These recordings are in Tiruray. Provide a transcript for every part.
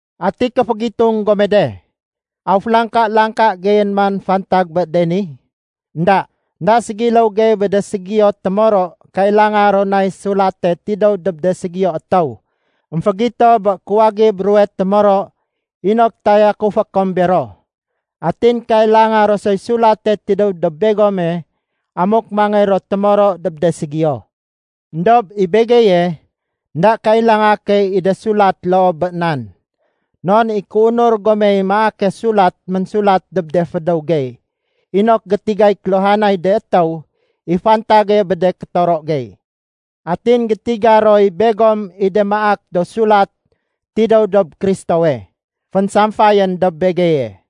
Ati kéfégitung gome de, aw félangka-langka geyén man fantag bé de ni? Enda. Enda ségiléw gey bé de ségiyo témoro kailanga ro nay sulate tidéw dob de ségiyo étéw émfégito bé kuwagib ruwe témoro inok tayakufé kom bero. Atin kailanga ro soy sulate tidéw dob begome amuk mangéy ro témoro dob de ségiyo. Endob i begeye, énda kailanga key i de sulat loo bé nan. Non i kéunur gomey maake sulat ménsulat dob de fédéw gey inok gétigay kéluhanay de étéw i fantage bé de kétoro gey. Atin gétiga roy begom i de maak do sulat tidéw dob Kristowe, fénsamfayén dob begeye.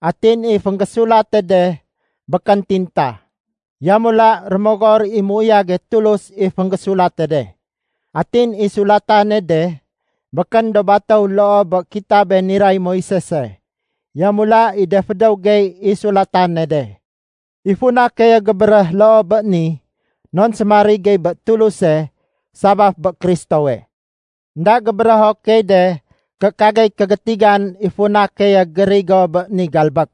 Atin i fénggésulate de békén tinta, yamula Rémogor i méuyage Tulus i fénggésulate de. Atin i sulatane de békén do batéw loo bé kitabe niray Moisese, yamula i de fédéw gey i sulatane de. I funa keye gébéréh loo bé ni non sémarig gey bé Tuluse, sabaf bé Kristowe. Enda gébérého key de ké kagey kégétigan i funa keye gérigo bé ni galbék.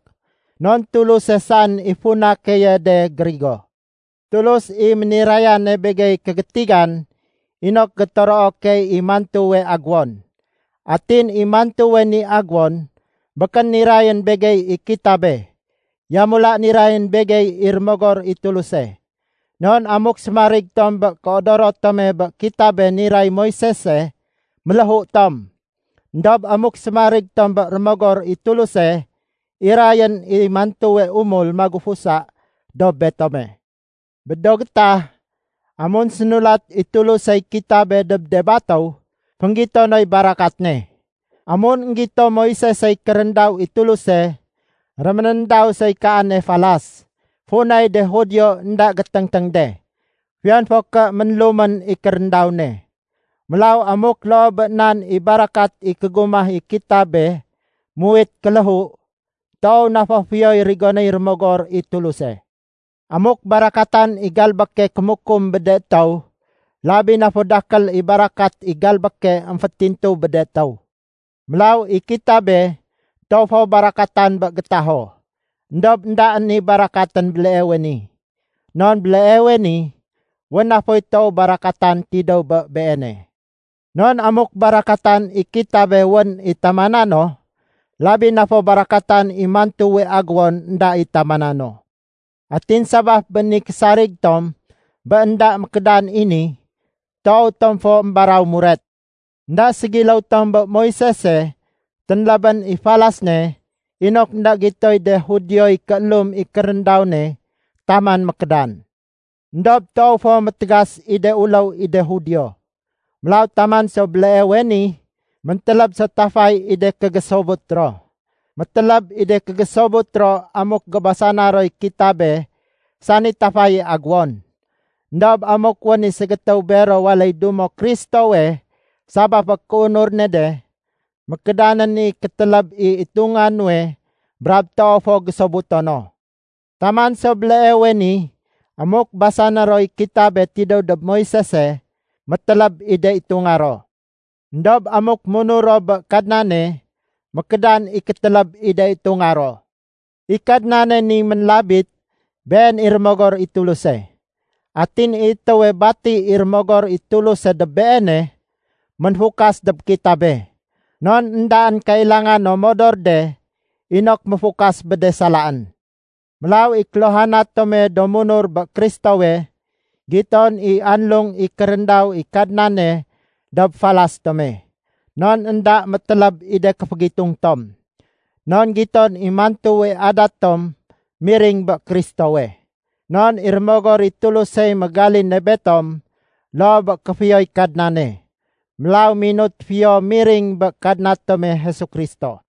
Non Tuluse saén i funa keye de gérigo. Tulus i ménirayane begey kégétigan inok gétoroo key i mantuwe agéwon. Atin i mantuwe ni agéwon, békén nirayén begey i kitabe, yamula nirayén begey i Rémogor i Tuluse. Non amuk sémarig tom bé kéodoro tome bé kitabe niray Moisese, méléhu tom. Endob amuk sémarig tom bé Rémogor i Tuluse, irayén i mantuwe umul magufusa dob betome. Bé do gétah, amun sénulat i Tulusey kitabe dob de batéw, fénggito noy barakat ne. Amun énggito Moisesey kéréndaw i Tuluse, réménéndaw soy kaane falas, funay de Judio énda géténgténg de, fiyon fo ké ménlumén i kéréndaw ne. Mélaw amuk loo bé nan i barakat i kégumah i kitabe muwit kéléhu, toow na fo fiyoy rigonéy Rémogor i Tuluse. Amuk barakatan i galbéke kémukum bé de étéw, labi na fo dakél i barakat i galbéke émfétintu bé de étéw. Mélaw i kitabe toow fo barakatan bé gétaho, éndob éndaén i barakatén béleewe ni. Non béleewe ni, wén na foy toow barakatan tidéw bé beene. Non amuk barakatan i kitabe wén i tamana no, labi na fo barakatan i mantuwe agéwon énda i tamana no. Atin sabaf bé ni késarig tom bé énda mékédan i ni, toow tom fo émbaraw muret. Enda ségiléw tom bé Moisese ténlébén i falas ne inok énda gitoy de Judioy kéélum i kéréndaw ne taman mékédan. Endob toow fo métégas i de uléw i de Judio. Mélaw taman so béleewe ni méntéléb so tafay i de kégésobut ro. Météléb i de kégésobut ro amuk gébasana roy kitabe sani tafaye agéwon. Endob amuk wén i ségétéw bero waléy dumo Kristowe sabaf bé kéunur ne de, mékédanén i kétéléb i itunga nuwe brab toow fo gésobuto no. Taman so béleewe ni amuk basané roy kitabe tidéw dob Moisese, météléb i de itunga ro. Endob amuk munur ro bé Kadnane, mékédan i kétéléb i de itunga ro. I Kadnane ni ménlabit, Been i Rémogor i Tuluse. Atin i étéwe bati i Rémogor i Tuluse dob beene, ménfukas dob kitabe, non éndaén kailanga no modor de inok méfukas bé de salaén. Mélaw i kéluhana tome do munur bé Kristowe, giton i anlung i kéréndaw i Kadnane dob falas tome, non énda météléb i de kéfégitung tom. Non giton i mantuwe adat tom miring bé Kristowe. Non i Rémogor i Tulusey mégaline betom loo bé kéfiyoy Kadnane. Mélaw minut fiyo miring bé Kadna tome Jesu Kristo.